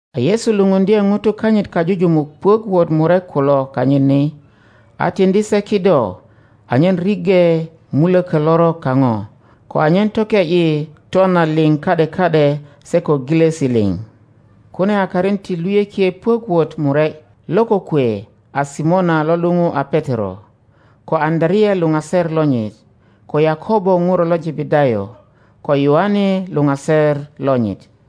A Yesu lupundye ŋutu kanyit kajujumuk puök wot murek kulo kanyit ni, a tiŋdi se kido anyen riŋge muloko lorok kaŋo, ko anyen toke ’yi twana liŋ ka ’de ka ’de se ko gilosi liŋ. Kune a karin ti luyökie puek wot murek: lo kokwe a Simona lo luŋu a Petero, ko Apöalea luŋaser lonyit; ko Yakobo ŋuro lo Jebedayo, ko Yoane luŋaser lonyit;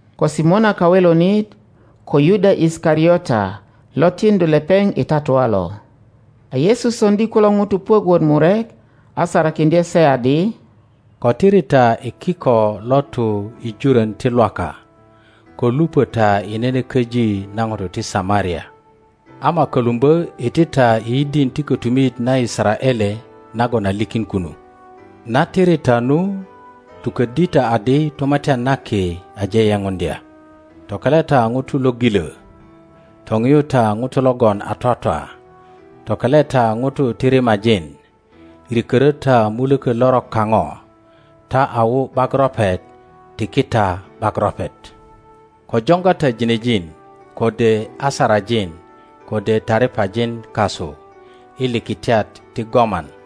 ko Simona Kawelonit, ko Yuda Isikariota lo tiŋdu lepeŋ i tatua lo. A Yesu soŋdi kulo ŋutu puök wot murek, a sarakiŋdye se adi, Ko tiri ta i kiko lo tu i jurön ti Lwaka, ko lupö ta i nene köji na ŋutu ti Samaria; ama kölumbö iti ta i yidin ti kotumit na Yisaraele nagon a likin kunu. Na tiri ta nu, tukoddi ta adi, Tumatyan na Ki aje yepuŋdya. Tokele ta ŋutu lo gilö, toŋiyu ta ŋutu logon a twatwa, tokele ta ŋutu ti rimajin, rikörö ta mulöko lorok kaŋo. Ta a wu ’bak ropet, tiki ta ’bak ropet. Ko joŋga ta ginejin, kode asarajin, kode taripajin kasu i likitiat ti goman,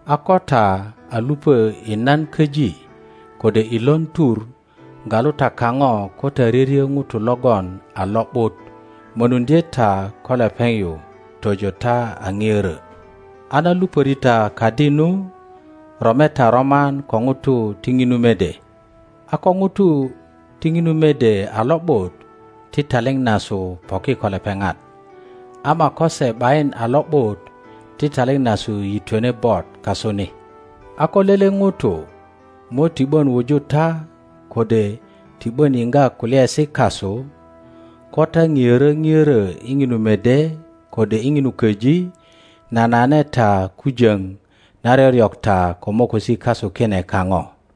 A ko ta a lupö i nan köji kode i lon tur, galu ta kaŋo ko ta ryöryö ŋuto logon a lo ’but, mönuŋdye ta ko lepeŋ yu tojo ta a ŋiörö. A na lupöri ta kadi nu, rome ta roman ko ŋutu ti ŋinu mede, a ko ŋutu ti ŋinu mede a lo ’but, ti taliŋ nasu poki ko lepeŋat, ama ko se ’bayin a lo ’but, ti taliŋ nasu yitwene bot kasu ni. A ko lele ŋuto mo ti ’bön wuju ta kode ti ’bön yiŋga kulyaesi kasu, ko ta ŋiörö ŋiörö i ŋinu mede kode i ŋinu köji, nanane ta kujöŋ na ryoryok ta ko mokosi kasu kine kaŋo.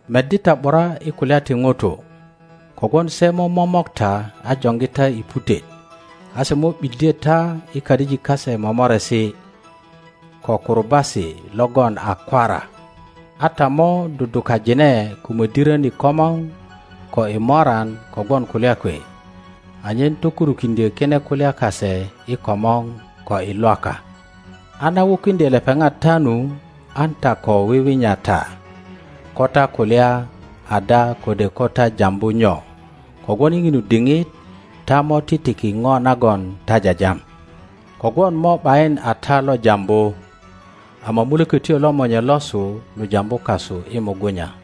Meddi ta ’bura i kulya ti ŋutu; kogwon se mo momok ta a joŋgi ta i putet, a se mo ’biddye ta i kadijik kase momoresi ko kurubasi logon a kwara, a ta mo dudukajine ko mödirön i komor ko i moran kogwon kulya kwe, anyen tokurukiŋdyö kine kulya kase i komor ko i Lwaka. A na wukiŋdye lepeŋat ta nu, an ta ko wiwinya ta ko ta kulya ada kode ko ta jambu nyo, kogwon i ŋinu diŋit ta mo titiki ŋo nagon ta jajam. Kogwon mo ’bayin a ta lo jambu, ama Mulökötyo lo Monye losu lo jambu kasu i mugunya.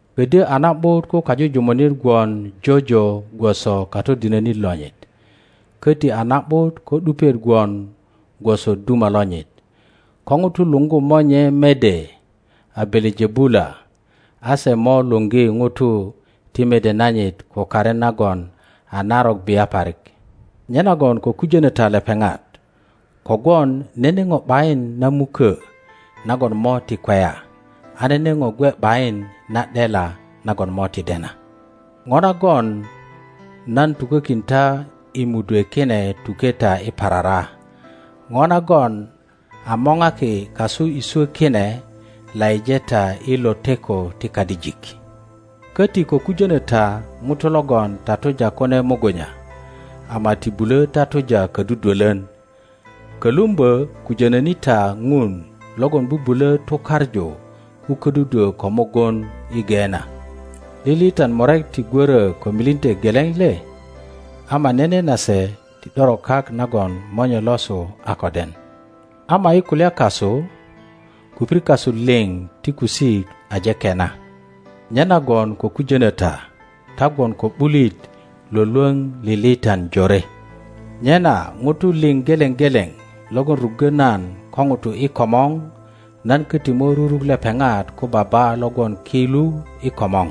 Ködyö a na ’but ko kajujumunit gwon jojo gwoso katodinönit lonyit, köti a na ’but ko ’dupiet gwon gwoso duma lonyit. Ko ŋutu luŋgu monye mede a Belejebula, a se mo luŋgi ŋutu ti mede nanyit ko karin nagon a narok bia parik! Nyenagem ko kujönö ta lepeŋat. Kogwon nene ŋo ’bayin na mukö nagon mo ti kweya, a nene ŋo gwe ’bayin na ’dela nagon mo ti dena. Ŋo nagon nan tukökin ta i mudwe kine tuke ta i parara; ŋo nagon a moŋaki kasu i swo kine laŋe ta i loteko ti kadijik. Köti ko kujönö ta ŋutu logon tatuja kune mugunya ama ti bulö tatuja kodudwölön; kolumbö kujönöni ta ŋun logon bubulö tukaŋu ko ködudwö ko mugun i Geena. Liliitan murek ti gwörö ko milinte geleŋ le? Ama nene nase ti ’doro kak nagon Monye losu a ko den. Ama i kulya kasu kupir kasu liŋ ti kusik aje kena. Nyenagon ko kujönö ta; ta gwon ko ’bulit lwölwoŋ liliitan jore. Nyena ŋutu liŋ geleŋ geleŋ logon ruggo nan ko ŋutu i komor, nan köti mo ruruk lepeŋat ko Baba lo gwon ki lu i komor;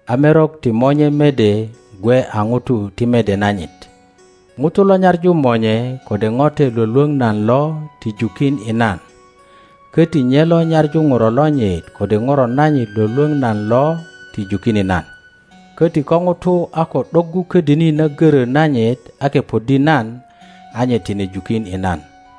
a merok ti monye mede gwe a ŋutu ti mede nanyit. Ŋuto lo nyaŋu monye kode ŋote lwölwöŋ nan lo ti jukin i nan, köti nye lo nyaŋu ŋuro lonyit kode ŋuro nanyit lwölwöŋ nan lo ti jukin i nan. Koti ko ŋuto a ko ’doggu ködini na görö nanyit a kepoddi nan a nye tine jukin i nan.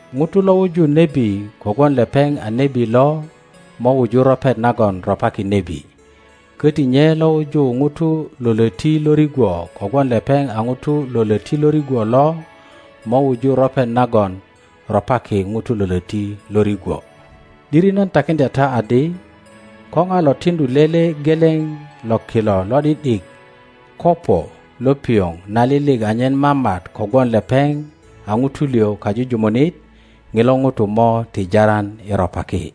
ŋuto lo wuju nebi kogwon lepeŋ a nebi lo mo wuju ropet nagon ropaki nebi, koti nye lo wuju ŋuto lo loti lo rigwo kogwon lepeŋ a ŋuto lo loti lo rigwo lo mo wuju ropet nagon ropaki ŋuto lo löti lo rigwo. ’Diri nan takiŋdya ta adi, ko ŋa lo tiŋdu lele geleŋ lo kilo lo ’di ’dik kopo lo piŋo nalilik anyen mamat kogwon lepeŋ a ŋuto liŋ kajujumunit, ŋilo ŋuto mo ti jaran i ropaki.